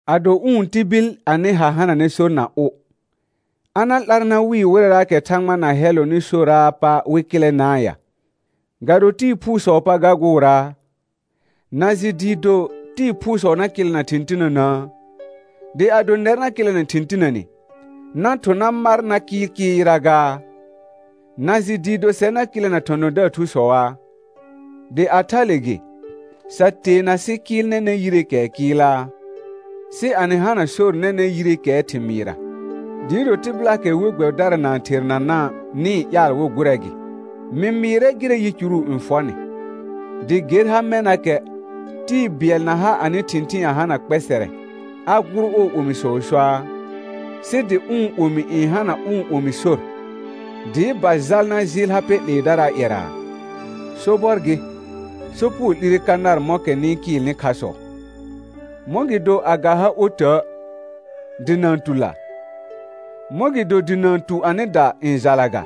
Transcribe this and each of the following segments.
Ado ʋ̃ tibil anɩ ha hananɛ sor na ʋ, a na 'lar na wɩɩ wɩrɛɛkɛ Thãgba na hɛllɔnɩ soraa pa wɩ kɩlɛnaa ya, ga do tɩɩ phuusɔɔ pa ga gʋʋraa? Na jɩ dɩɩ do tɩɩ phuusɔ na kɩlɛna thɩ̃ tinənəə? Dɩ ado nɛr na kɩlɛna thɩ̃ tinəne, na thʋ̃ na mar na kɩɩl kɩɩl yɩra gaa? Na jɩ dɩɩ do sɛr na kɩlɛna thɔ̃thɔ̃daar thusɔaa? Dɩ a thale gɩ, sa teena sɩ kɩɩl nɛnɛ̃ yireekɛɛ kɩɩlaa? Sɩ a nɩ hana kha sor nɛnɛ̃ yireekɛɛ thɩmɩɩra, dɩɩ do tɩbɩlaakɛ we gbɛbɩdara na-n thernana' nɩ-n ƴaal wɩ gʋrɛ gɩ. Mɩ mɩɩrɛ gɩrɛ yicuru n fɔ nɩ, dɩ ger ha mɛnakɛ, tɩɩ bɩɛl na ha anɩ thɩ̃thɩɩn a hana kpɛsɛrɛ, a gʋʋr ɔɔ omisɔɔ soaa? Sɩ dɩ ʋ̃ omi n hana ʋ̃ omi sor, dɩɩ ba jal na jɩɩl ha pɛ 'leedaraa ƴɛra? Sobɔr gɩ, sopugo 'lire ka nar mɔ̃kɛ nɩ-n kɩɩlnɩ khasɔ. Mɔ̃gɩdo a ga ha otə' dɩ na-n tu la? Mɔ̃gɩdo dɩ na-n tu anɩda n jala ga?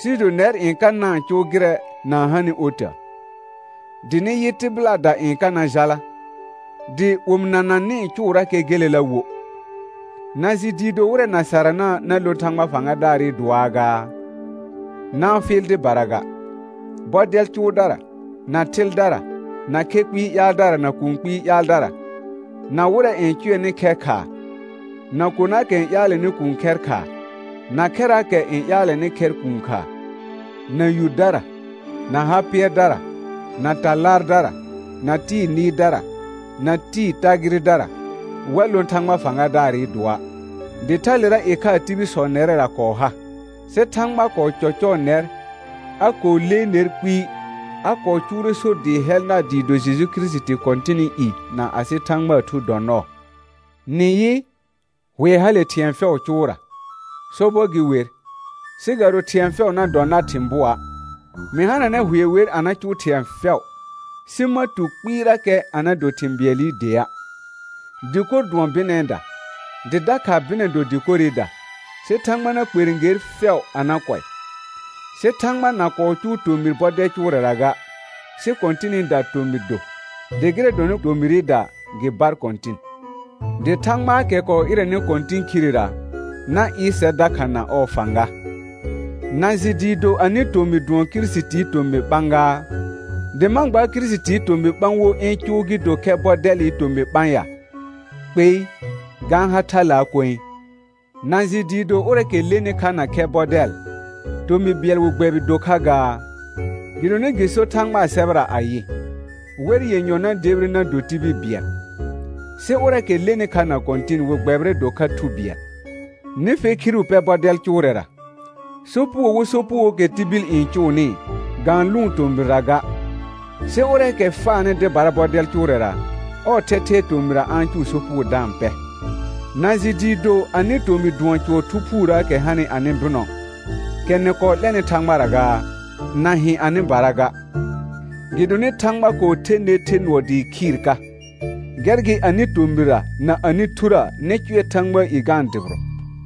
Sɩɩ do nɛr n ka na-n cʋʋ gɩrɛ na-n hanɩ otə', dɩ nɩ yɩ tɩbɩlaada n ka na jala, dɩ omɩnana nɩ-n cʋʋrakɛ gelela wo. Na jɩ dɩɩ do wɩrɛ na sarana na lõ Thãgba fãgadaarɩ dʋɔaa gaa? Na-n fɩɩl dɩbara ga: Bɔdɛl cʋʋdara, na thɩldara, na khɛ kpɩɩ ƴaaldara na kũu kpɩɩ ƴaaldara, na wɩrɛ n cʋɛnɩ khɛr khaa, na konaakɛ n ƴaalɛnɩ kuun khɛr khaa, na khɛraakɛ n ƴaalɛnɩ khɛr kuun kha, na yudara, na ha pɩɛrdara, na ta laardara, na tɩɩ nɩɩrdara, na tɩɩ tagɩrɩdara, wa lõ Thãgba fãgadaarɩ dʋɔa'. Dɩ thalera ɩkhaa tibilsɔ nɛrɛra kɔɔ ha, sɩ Thãgba kɔɔ cɔcɔɔ nɛr, a kɔɔ lee ner kpɩɩ, a kɔɔ cʋʋrɛ sor dɩɩ hɛl nar dɩɩ do Jeju Kirisiti Kɔ̃tɩnɩ i na asɩ Thãgbaa Thu dɔ nɔɔ. Nɩ yɩ, hʋɛ hale thɩ̃ɛ fɛʋʋ cʋʋra, sobɔr gɩ wer, sɩ ga do thɩ̃ɛ fɛʋ na dɔ nar thɩ̃ bʋɔa'. Mɩ hananɛ hʋɛ wer a na cʋʋ thɩ̃ɛ fɛʋ, sɩ ma tu kpɩɩrakɛ a na do thɩ̃ bɩɛlɩ dea'. Dɩkor dʋɔn bɩnɛɛda, dɩ dakha bɩnɛ do dɩkorɩda; sɩ Thãgba na kperẽ ger fɛʋ a na kʋɛ. Sɩ Thãgba na kɔɔ cʋʋ tomɩr bɔdɛl cʋʋrɛra ga, sɩ Kɔ̃tɩnɩda tomɩr do, dɩ gɩrɛ dɔnɩ tomɩrɩda gɩ bar Kɔ̃tɩn. Dɩ Thãgbaakɛ kɔɔ ɩrɛnɩ Kɔ̃tɩn khirera, na ɩɩr sɛr dakha na ɔɔ fãga. Na jɩ dɩɩ do anɩ tomɩ dʋɔn Kirisitii tomɩ ɓã gaa? Dɩ ma gbaar Kirisitii tomɩ ɓã wo ɩ̃ cʋʋ gɩ do khɛ bɔdɛlɩ tomɩ ɓã ya? Kpei, ga-n ha thalaa koe. Na jɩ dɩɩ do ʋrɛɛkɛ lenɩ kha na khɛ bɔdɛl, tomɩ bɩɛl wɩ gbɛbɩ do kha gaa? Gɩdonɩ gɩ sor Thãgbaa sɛbɛra ayɩ: «Wɛr yenyɔ na debire na do tibil bɩɛl.» Sɩ ʋrɛɛkɛ lenɩ kha na Kɔ̃tɩn wɩ gbɛbɩrɛ do kha thu bɩɛl. Nɩ fe khiru pɛ bɔdɛl cʋʋrɛra. Sopugo wo sopugookɛ tibil n cʋʋnɩ, ga-n lʋ̃ʋ tomɩrra ga, sɩ ʋrɛɛkɛ faanɩ dɩbara bɔdɛl cʋʋrɛra, ɔɔ thɛthɛɛ tomɩra a-n cʋʋ sopugo da-n pɛ. Na jɩ dɩɩ do anɩ tomɩ dʋɔn cʋɔr Thu Phuurəəkɛ hanɩ anɩ bɩnɔ, kɛ nɩ kɔɔ 'lɛnɩ Thãgbara gaa? Na hɩ̃ anɩbara ga. Gɩdonɩ Thãgba kɔɔ the ner the nʋɔ dɩɩ khɩɩr ka, gɛr gɩ anɩ tomɩra na anɩ thurə nɩ cʋɛ Thãgbaa i ga-n dʋbɩrɔ.